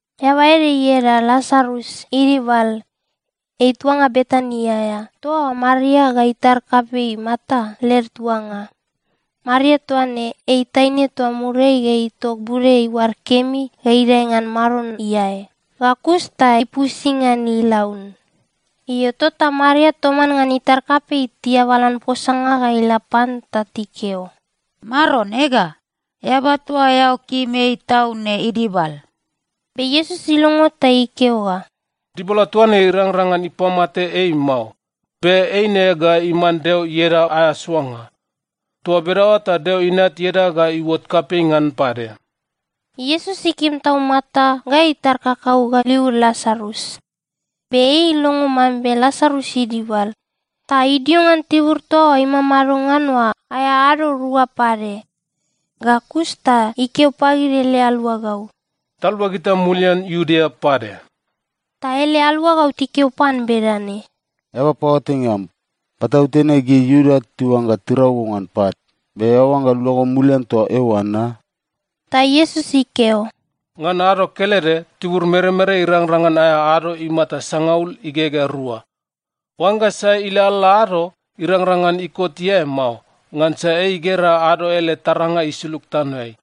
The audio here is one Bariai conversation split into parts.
Eaba ede ieda Lasarus idibal. Ei tuanga Betani aea, toa Maria ga itar kapei Marta led tuanga. (Maria toa ne, ei taine toa muriai ga itok bude iuad kemi ga idae ngan Maron iae, ga kus ta ipusi ngan ilaun.) Io, tota Maria toman ngan itar kapei tiabalan posanga ga ila pan ta tikeo, “Maron, ega, eaba toa eao kim ei tau ne idibal.” Be Iesus ilongo ta ikeo ga, “Dibala toa ne irangrang ngan ipamate ei mao. Be eine ga iman Deo ieda aea soanga. Toa bedaoa ta Deo Inat ieda ga iuot kapei ngan pade.” Iesus ikim tau Marta ga itar kakau ga liud Lasarus. Be ei ilongo mambe Lasarus idibal, ta idio ngan tibur toa imamado ngan oa aea ado rua pade. Ga kus ta ikeo pagid ele aluagau, “Taluagita mulian Iudea pade.” Ta ele aluagau tikeo pan bedane, “Eaba paoatainga am, patautene gid Iuda tiuangga tirau go ngan pat, be eao oangga luago mulian toa eoa na?” Ta Iesus ikeo, “Ngan ado kelede, tibur meremere irangrang ngan aea ado imata sangaul igegea rua. Oangga sai ilalala ado, irangrang ngan ikot iae mao, ngansa ei igera ado ele taranga isulug tanoeai.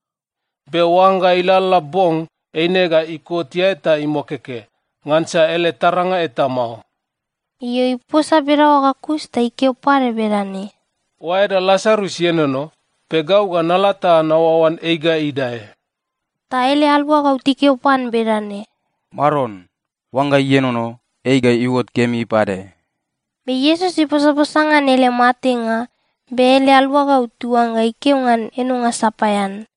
Be oangga ilalala bong, eine ga ikot iae ta imokeke, ngansa ele taranga eta mao.” Io, iposa bedaoa ga kus, ta ikeo pade bedane, “Oaeda Lasarus ienono. Be gau ga nala ta naoaoan ei ga idae.” Ta ele aluagau tikeo pan bedane, “Maron, oangga ienono, ei ga iuot kemi pade.” Be Iesus iposaposa ngan ele matenga, be ele aluagau tiuangga ikeo ngan enonga sapaean.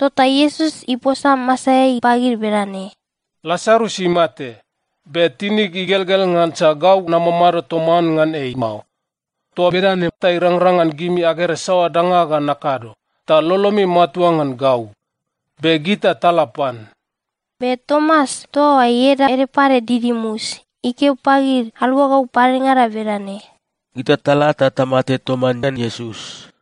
Tota Iesus iposa masaeai pagid bedane, “Lasarus imate. Be tinig igelgel ngansa gau namamado toman ngan ei mao. Toa bedane ta irangrang ngan gimi agera saoa danga ga nakado, ta lolomi matua ngan gau. Be gita tala pan.” Be Tomas toa ieda ede pade Didimus ikeo pagid aluagau padengada bedane, “Gita tala, ta tamate toman ngan Iesus.”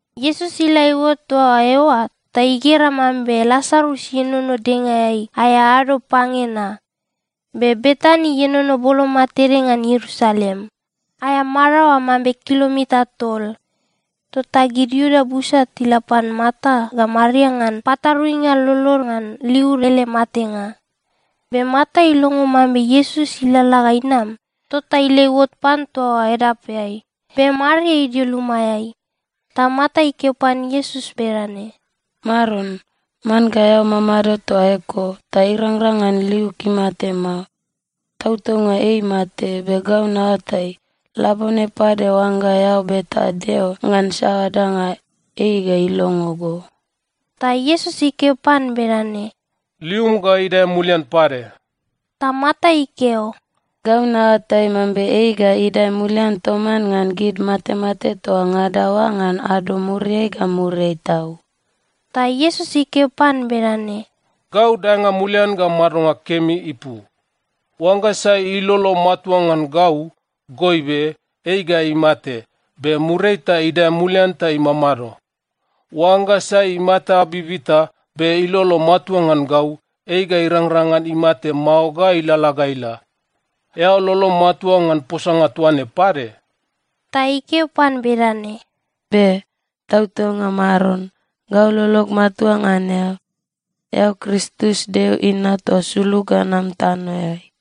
Iesus ila iuot toa eoa ta igera mambe Lasarus ienono dengaeai aea ado pange na. Be Betani ienono boloma tede ngan Ierusalem. Aea maraoa mambe kilomita tol. Tota gid Iuda busa tila pan Marta ga Maria ngan pataruinga lolod ngan liud ele matenga. Be Marta ilongo mambe Iesus ilalala ga inam, tota ila iuot pan toa edapeai, be Maria idio lumaeai. Ta Marta ikeo pan Iesus bedane, “Maron, man ga eao mamado toa eko, ta irangrang ngan liug imate mao! Tautaunga ei imate, be gau naoatai, labone pade oangga eao beta Deo ngan saoa danga, ei ga ilongo go.” Ta Iesus ikeo pan bedane, “Lium ga idae mulian pade.” Ta Marta ikeo, “Gau naoatai mambe ei ga idae mulian toman ngan gid matemate toa ngada oa ngan ado muriai ga muriai tau.” Ta Iesus ikeo pan bedane, “Gau daenga mulian ga madonga kemi ipu. Oangga sai ilolo matua ngan gau, goibe, ei ga imate, be muriai ta idae mulian ta imamado. Oangga sai imata bibita be ilolo matua ngan gau, ei ga irangrang ngan imate mao ga ilalala ga ila. Eao lolom matua ngan posanga toa ne pade?” Ta ikeo pan bedane, “Be. Tautaunga Maron, gau lolog matua ngan eao. Eao Kristus, Deo Inat toa sulug ga nam tanoeai.”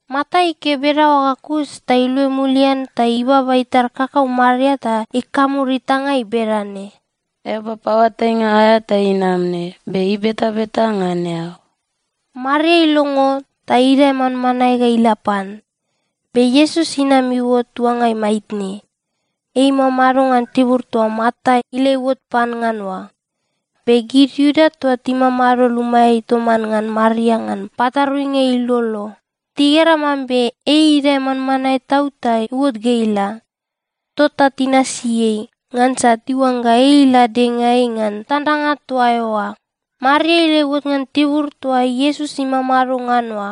Marta ikeo bedaoa ga kus, ta iluai mulian ta ibaba itar kakau Maria ta ikamur itangai bedane, “Eaba paoatainga aea ta inam ne, be ibetabeta ngan eao.” Maria ilongo, ta idae manmanae ga ila pan. Be Iesus inam iuot tuangai maitne. Ei imamado ngan tibur toa Marta ila iuot pan ngan oa. Be gid Iuda toa timamado lumaeai toman ngan Maria ngan pataruinga ilolo, tigera mambe ei idae manmanae tau ta iuot ga ila. Tota tinasi ei, ngansa tiuangga ei ila dengaeai ngan tandanga toa eoa. Maria ila iuot ngan tibur toa Iesus imamado ngan oa,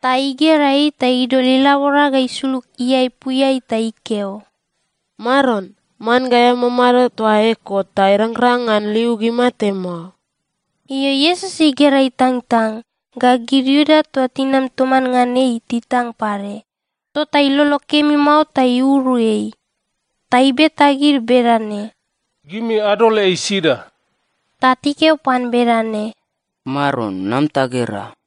ta igera ei ta idol ilabora ga isulug iaepuiai ta ikeo, “Maron, man ga eao mamado toa eko, ta irangrang ngan liug imate mao!” Io, Iesus igera itangtang, ga gid Iuda toa tinam toman ngan ei titang pade, tota ilolo kemi mao ta iuru ei. Ta ibeta gid bedane, “Gimi adol ei sida?” Ta tikeo pan bedane, “Maron, nam ta gera.”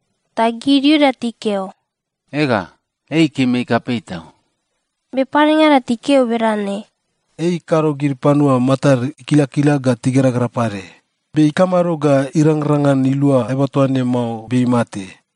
Ta gid Iuda tikeo, “Ega, ei ikim ei kapei tau.” Be padengada tikeo bedane, “Ei ikado gid panua matad ikilakila ga tigeragera pade, be ikamado ga irangrang ngan ilua eaba toa ne mao be imate?”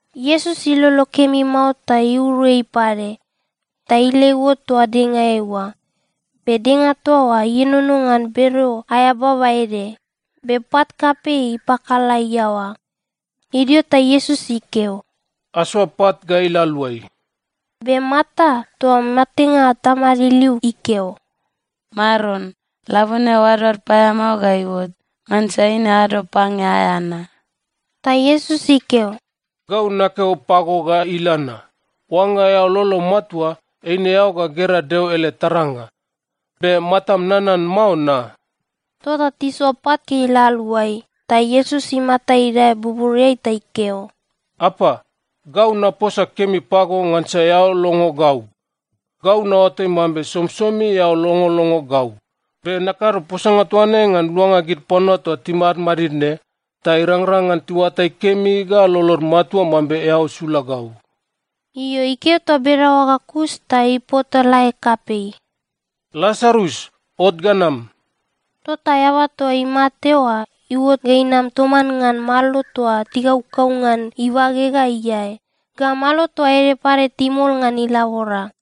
Iesus ilolo kemi mao ta iuru ei pade. Ta ila iuot toa dengaeai oa. Be denga toa oa ienono ngan bereo aea baba ede, be pat kapei ipakala iaoa. Idio ta Iesus ikeo, “Asoa pat ga ila aluai.” Be Marta, toa matenga tamad iliu ikeo, “Maron, labone oadoad paeamao ga iuot, ngansa eine ado pange aea na.” Ta Iesus ikeo, “Gau nakeo pago ga ila na, oangga eao lolom matua, eine eao ga gera Deo ele taranga. Be matam nanan mao na?” Tota tisoa pat ga ila aluai, ta Iesus imata idae buburiai ta ikeo, “Apa, gau naposa kemi pago ngansa eao longo gau. Gau naoatai mambe somisomi eao longolongo gau, be nakado posanga toa ne ngan luanga gid panua toa timadmadid ne ta irangrang ngan tiuatai kemi ga lolod matua mambe eao sula gau.” Io, ikeo toa bedaoa ga kus ta ipotalae kapei, “Lasarus, ot ga nam!” Tota eaba toa imate oa iuot ga inam toman ngan malo toa tikaukau ngan ibage ga iae, ga malo toa ede pade timol ngan ilabora.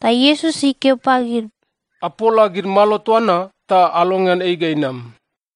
Ta Iesus ikeo pagid, “Apola gid malo toa na ta alongean ei ga inam.”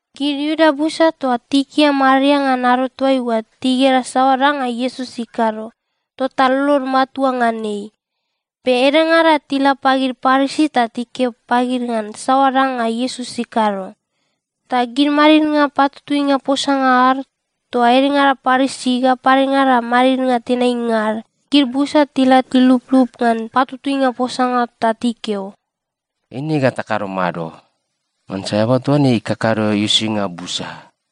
Gid Iuda busa toa tikia Maria ngan ado toaiua, tigera saoa danga Iesus ikado, tota lolod matua ngan ei. Be edengada tila pagid Parisi ta tikeo pagid ngan saoa danga Iesus ikado. Ta gid madidnga patutuinga posanga ad, toa edengada Parisi ga padengada madidnga tenainga ad, gid busa tila tiluplup ngan patutuinga posanga ta tikeo, “Eine ga takado mado? Ngansa eaba toa ne ikakado uisinga busa.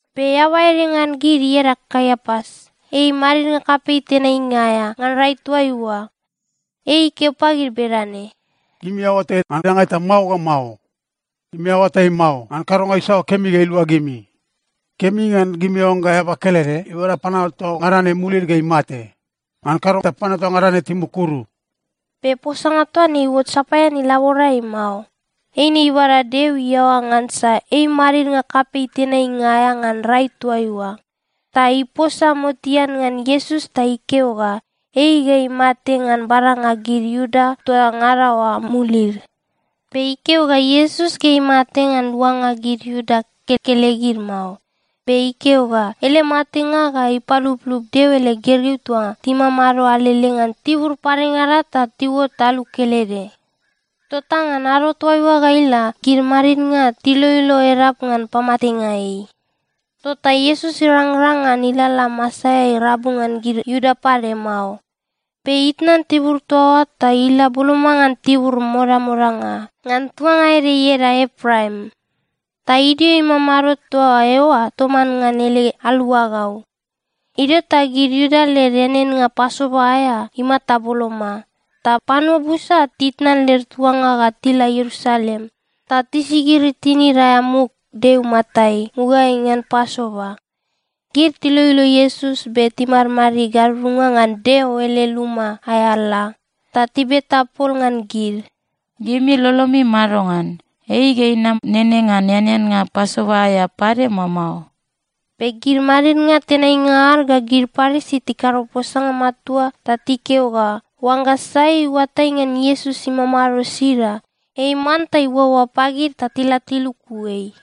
Be eaba ede ngan gid, ieda Kaiapas, ei madidnga kapei tenainga aea ngan rai toaiua. Ei ikeo pagid bedane, “Gimi aoatai ngan danga eta mao ga mao. Gimi aoatai mao ngan kadonga isaoa kemi ga ilua gimi. Kemi ngan gimi oangga eaba kelede ibada panua toa ngada ne mulid ga imate. Ngan kado ta panua toa ngada ne timukuru.” Be posanga toa ne iuot sapaean ilaborai mao. Eine ibada Deo iaoa ngansa ei madidnga kapei tenainga aea ngan rai toaiua, ta iposa motean ngan Iesus ta ikeo ga ei ga imate ngan badanga gid Iuda toa ngada oa mulid. Be ikeo ga Iesus ga imate ngan luanga gid Iuda kekelegid mao, be ikeo ga ele matenga ga ipaluplup Deo ele gergeu toa timamado alele ngan tibur padengada ta tiuot alu kelede. Tota ngan ado toaiua ga ila, gid madidnga tiloilo edap ngan pamatenga ei. Tota Iesus irangrang ngan ilalala masaeai rabu ngan gid Iuda pade mao. Be itnan tibur toa oa ta ila boloma ngan tibur modamodanga, ngan tuanga ede ieda Epraim. Ta idio imamado toa eoa toman ngan ele aluagau. Idio ta gid Iuda led eaneannga Pasova aea imata boloma, ta panua busa titnan led tuanga ga tila Ierusalem ta tisigiri tinid aea muk Deo imatai mugaeai ngan Pasova. Gid tiloilo Iesus be timadid gadudunga ngan Deo ele luma aea ala, ta tibeta pol ngan gid, “Gimi lolomi madongan? Ei ga inam nene ngan eaneannga Pasova aea pade, mao mao?” Be gid madidnga tenainga ad ga gid Parisi tikado posanga matua ta tikeo ga oangga sai iuatai ngan Iesus imamado sida, ei manta iuaoa pagid ta tila tiluku ei.